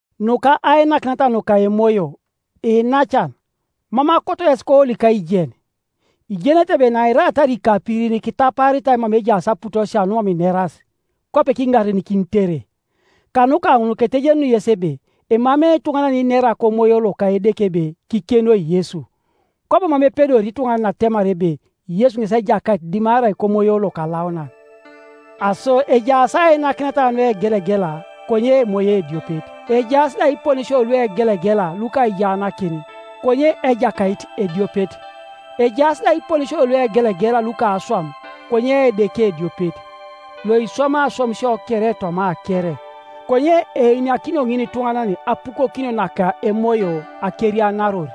Nuka ainakineta nuka emoyo, iinacan, mam akoto yes koolik aijen. Ijenete ebe nairaatar ikapirin kitapaaritai mama ejaas aputosia numam ineras, kwape kiŋarenikinitere. Kanuka ŋun ketejenuni yes ebe emamei ituŋanan yeninera kOmoyo loka Edeke ebe, “Kikenoi Yesu!” kwabo mam epedori ituŋanan atemar ebe, “Yesu ŋes Ejakait,” dimarai kOmoyo Lokalaunan. Aso ejaas ainakineta nuegelegela, konye Emoyo ediopet; ejaas da iponesio luegelegela luka aijaanakin, konye Ejakait ediopet; ejaas da iponesio luegelegela luka aswam, konye Edeke ediopet, loiswamai aswamisio kere toma kere. Konye einakinio ŋinituŋanan apukokinio naka Emoyo akerianaror.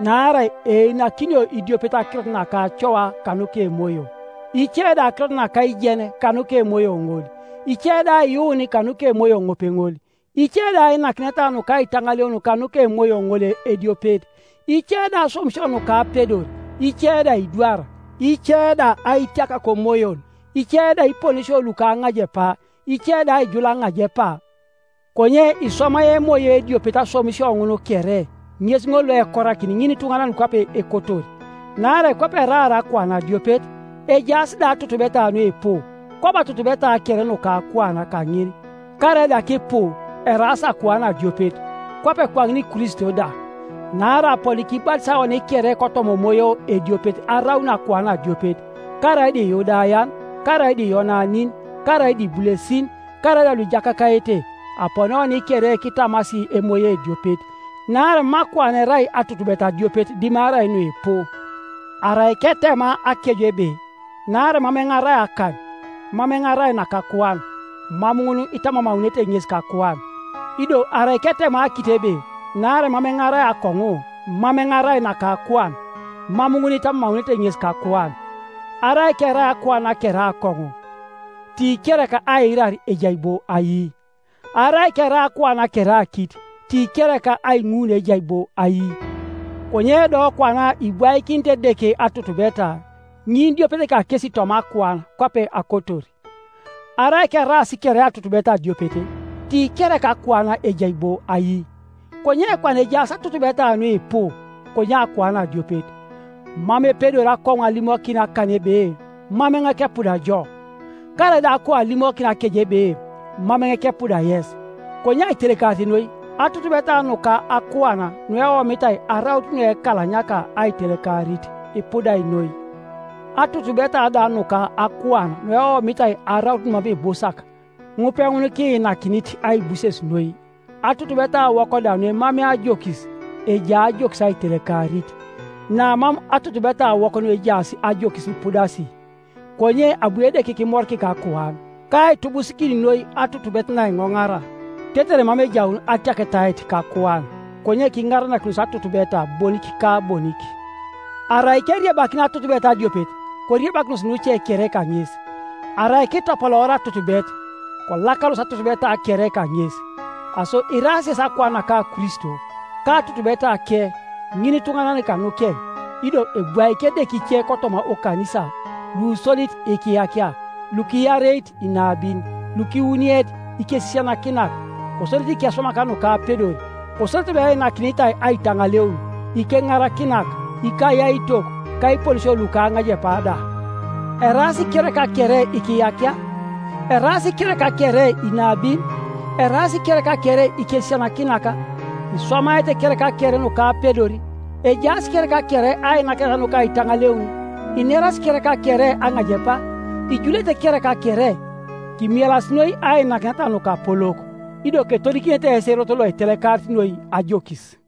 Naarai einakinio idiopet akirot naka acoa kanuka Emoyo, ice da akirot naka aijen kanuka Emoyo ŋol, ice da aiyuun kanuka Emoyo ŋopeŋol, ice da ainakineta nuka aitaŋaleun kanuka Emoyo ŋol ediopet, ice da aswamisio nuka apedor, ice da aidwar, ice da aitiak komoyon, ice da iponesio luka aŋajepa, ice da aijul aŋajepa. Konye iswamai Emoyo ediopet aswamisio ŋun kere, ŋes ŋol loekorakini ŋinituŋanan kwape ekotor. Naarai kwape eraar akuan adiopet, ejaas da atutubeta nuipu, kwabo atutubeta kere nuka akuan kaŋin, karaida kipu, eraas akuan adiopet, kwape kwaŋin Kristo da. Naarai aponi kibatisai oni kere kotoma emoyo ediopet araun akuan adiopet, karaida Iyudayan, karaida Iyonanin, karaida ibulesin, karaida luijakakaete-aponi oni kere kitamasi Emoyo ediopet. Naarai mam akuan erai atutubet adiopet dimarai nuipu. Arai ketema akeju ebe, “Naarai mam eoŋ arai akan, mam eoŋ arai naka akuan,” mam ŋun itamamaunete ŋes kakuan. Ido arai ketema akit ebe, “Naarai mam eoŋ arai akoŋu, mam eoŋ arai naka akuan,” mam ŋun itamamaunete ŋes kakuan, Arai kerai akuan kere akoŋu, ti kereka aiirar ejai bo ai? Arai kerai akuan kere akit, ti kereka aiŋuun ejai bo ai? Konye do kwana ibwaikinit Edeke atutubeta, ŋinidiopet kakesi toma akuan kwape akotor. Arai keraas kere atutubet adiopet, ti kereka akuan ejai bo ai? Konye kwana ejaas atutubeta nuipu, konye akuan adiopet. Mam epedori akoŋu alimokin akan ebe, “Mam eoŋ kepuda jo,” karaida akou alimokin akeje ebe, “Mam eoŋ kepuda yes.” Konye aitelekarit noi, atutubeta nuka akuan nueomitai araut nuekalanyaka aitelekarit, ipudai noi, atutubeta da nuka akuan nueomitai araut numam ibusak, ŋupeŋun kiinakinit aibuses noi, atutubetawok da nuemamei ajokis, ejai ajokis aitelekarit, namam atutubetawok nuejaas ajokis ipudasi. Konye abu Edeke kimorikik akuan, kaitubusikin noi atutubet naiŋoŋara, tetere mam ejaun atiaketait kakuan, konye kiŋaranakinos atutubeta bonik ka bonik. Arai keriebakin atutubet adiopet, koriebakinos nuce kere kaŋes; arai kitopoloor atutubet, kolakaros atutubeta kere kaŋes. Aso iraas yesi akuan naka Kristo, ka atutubetake, ŋinituŋanan kanukeŋ. Ido ebwaik Edeke ice toma oKanisa, lusodit ikiyakia, lukiareit inabin, lukiwuniet ikesisianakinak, kosodete ikeswamak nukapedor, kosodete lueinakinitai aitaŋaleun, ikeŋarakinak, ikayaitok, ka iponesio luka aŋajepa da. Eraas kereka kere ikiyakia? Eraas kereka kere inabin? Eraas kereka kere ikesisianakinak? Iswamaete kereka kere nukapedor? Ejaas kereka kere ainakineta nuka aitaŋaleun? Inerasi kereka kere aŋajepa? Ijulete kereka kere? Kimielas noi ainakineta nukapolok. Ido ketodikinete yes erot loitelekarit noi ajokis.